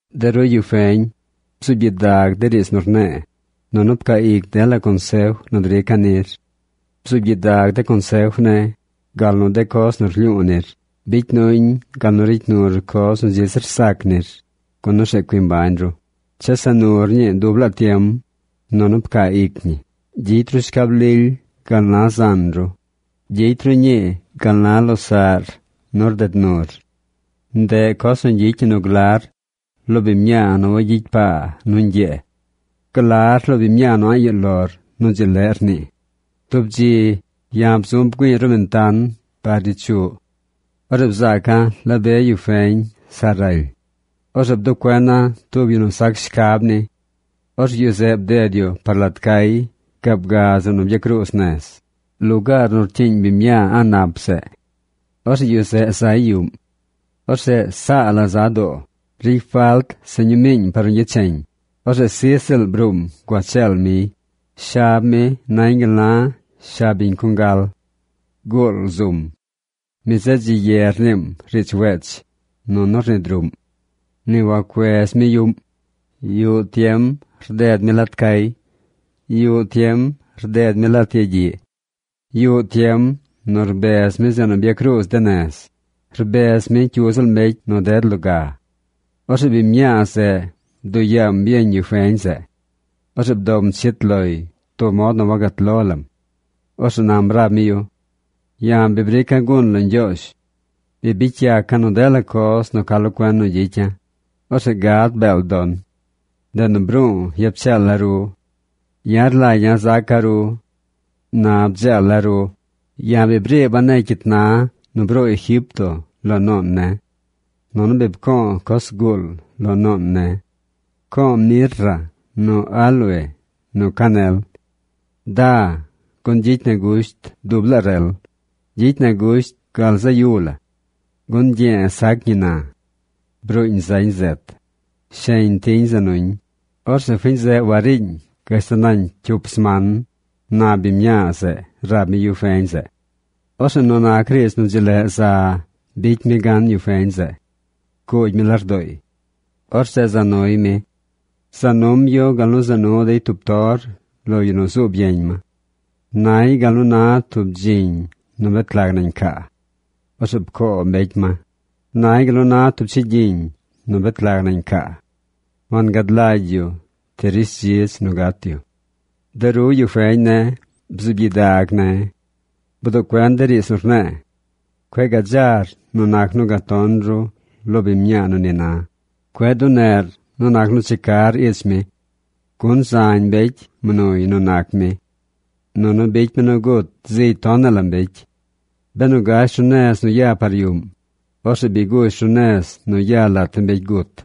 De ru yu feñ, bzuub gyidag de riidz nu rne̱e̱, nunu pcaa ic dela consef nu drica̱ nir. Bzuub gyidag de consef ne̱, gal nu de coz nu rlyu̱u̱ nir. Bicy nuñ gal nu ricy nur coz nu dzi zir sac nir, gun orzeꞌ cui mbañ ru. Chesa nur ñii dub laa tiem, nunu pcaa ic ñi. Gyicy ru shcab lily gal na zan ru. Gyicy ru ñii par losaꞌr nu rded nur. Ndeꞌ coz nu gyicy ñi nu glar lo biñ mñaa nu wayicy paa nu ñgyee. Glar lo biñ mñaa nu a̱ꞌ yuꞌ lor nu dzi leꞌ rnii. Tub dzi ya̱ bzu̱ bgüi̱i̱ ruꞌ bentan par ich yuꞌ. Orzeꞌ bzaca̱ la be yu feñ sa raly. Orzeꞌ bduꞌ cuena̱ tub yu nu sac shcab ni. Orzeꞌ yu zeꞌ bded yu par lat cay gaab ga zeꞌ byacruuz nez, lugaar nu rcyiiñ biñ mñaa a̱ꞌ nap zeꞌ. Orzeꞌ yu zeꞌ zay yuꞌm. Or zeꞌ sa la za doo. Ricy falt se ñumiiñ par nu gyecheñ. Orzeꞌ sij ziꞌl bruum gua cheel miy. Shab mi nañ gal nu na shab biñ congal. Guul zum. Mi zeꞌ dzi ye rniim riidz wech, nunu rnid ruꞌm. Ni wacuez mi yuꞌm. Yuꞌ tiem rded mi lat cay. Yuꞌ tiem rded mi lat yagyiꞌ. Yuꞌ tiem nu rbez mi zeꞌ nu byacruuz de nez, rbez mi cyu ziꞌl mbecy nu ded loga. Orzeꞌ biñ mñaa zeꞌ bduꞌ yaam yeñ yu feñ zeꞌ. Orzeꞌ bdom chit loy tub mod nu wagat lo lam. Orzeꞌ nam rab mi yu: “Ya̱ bi brica̱ gun lo Ñgyoozh. Bi bicy yaca̱ nu dela coz nu ca lo cuen nu gyicya̱. Orzeꞌ gad beel don. Ndeꞌ nu bru̱u̱ yap cheela̱ ru. Ya̱ rlagya̱ zaca̱ ru. Na bdzeela̱ ru. Ya̱ bi briiba̱ negy cyit na nu bruu Egipto lo nuun ne̱. Nunu bi pco̱o̱ coz zguul lo nuun ne̱. Pco̱o̱ mirra nu aloe nu canel. Da, gun gyicy na gusht dub laa rel. Gyicy na gusht gal zaꞌ yu la. Gun ñgye̱e̱ sac ñi na. Bruuñ zañ zet. Sheñ tiñ za nuñ. Orzeꞌ fiñ zeꞌ wariiñ gashtal nañ cyup sman”, na biñ mñaa zeꞌ rab mi yu feñ zeꞌ. Orzeꞌ nu nac riidz nu dzi leꞌ za bicy mi gan yu feñ zeꞌ. Pcuugy mi lardooy. Orzeꞌ za nuy mi. Za num yu gal nu za nu dey tub tor lo yu nu zuub yeñ ma. Nay gal nu na tub dziñ nu bet lag nañ caa. Orzeꞌ pcoo mbecy ma. Nay gal nu na tub chigyiñ nu bet lag nañ caa. Wangad lagy yu ti rishdzidz nu gat yu. De ru, yu feñ ne̱, bzuub gyidag ne̱. Bduꞌ cuen de riidz nu rne̱e̱. Cueꞌ gadzar nu nac nu gaton ru lo biñ mñaa nu ni na. Cueꞌ duneꞌr nu nac nu checar ich mi. Gun zañ mbecy mnuy nu nac mi. Nunu bicy mi nu gut zigy tonaꞌ la mbecy. Benu gash ru nez nu ya par yuꞌm, orzeꞌ bi gush ru nez nu ya lat de mbecy gut.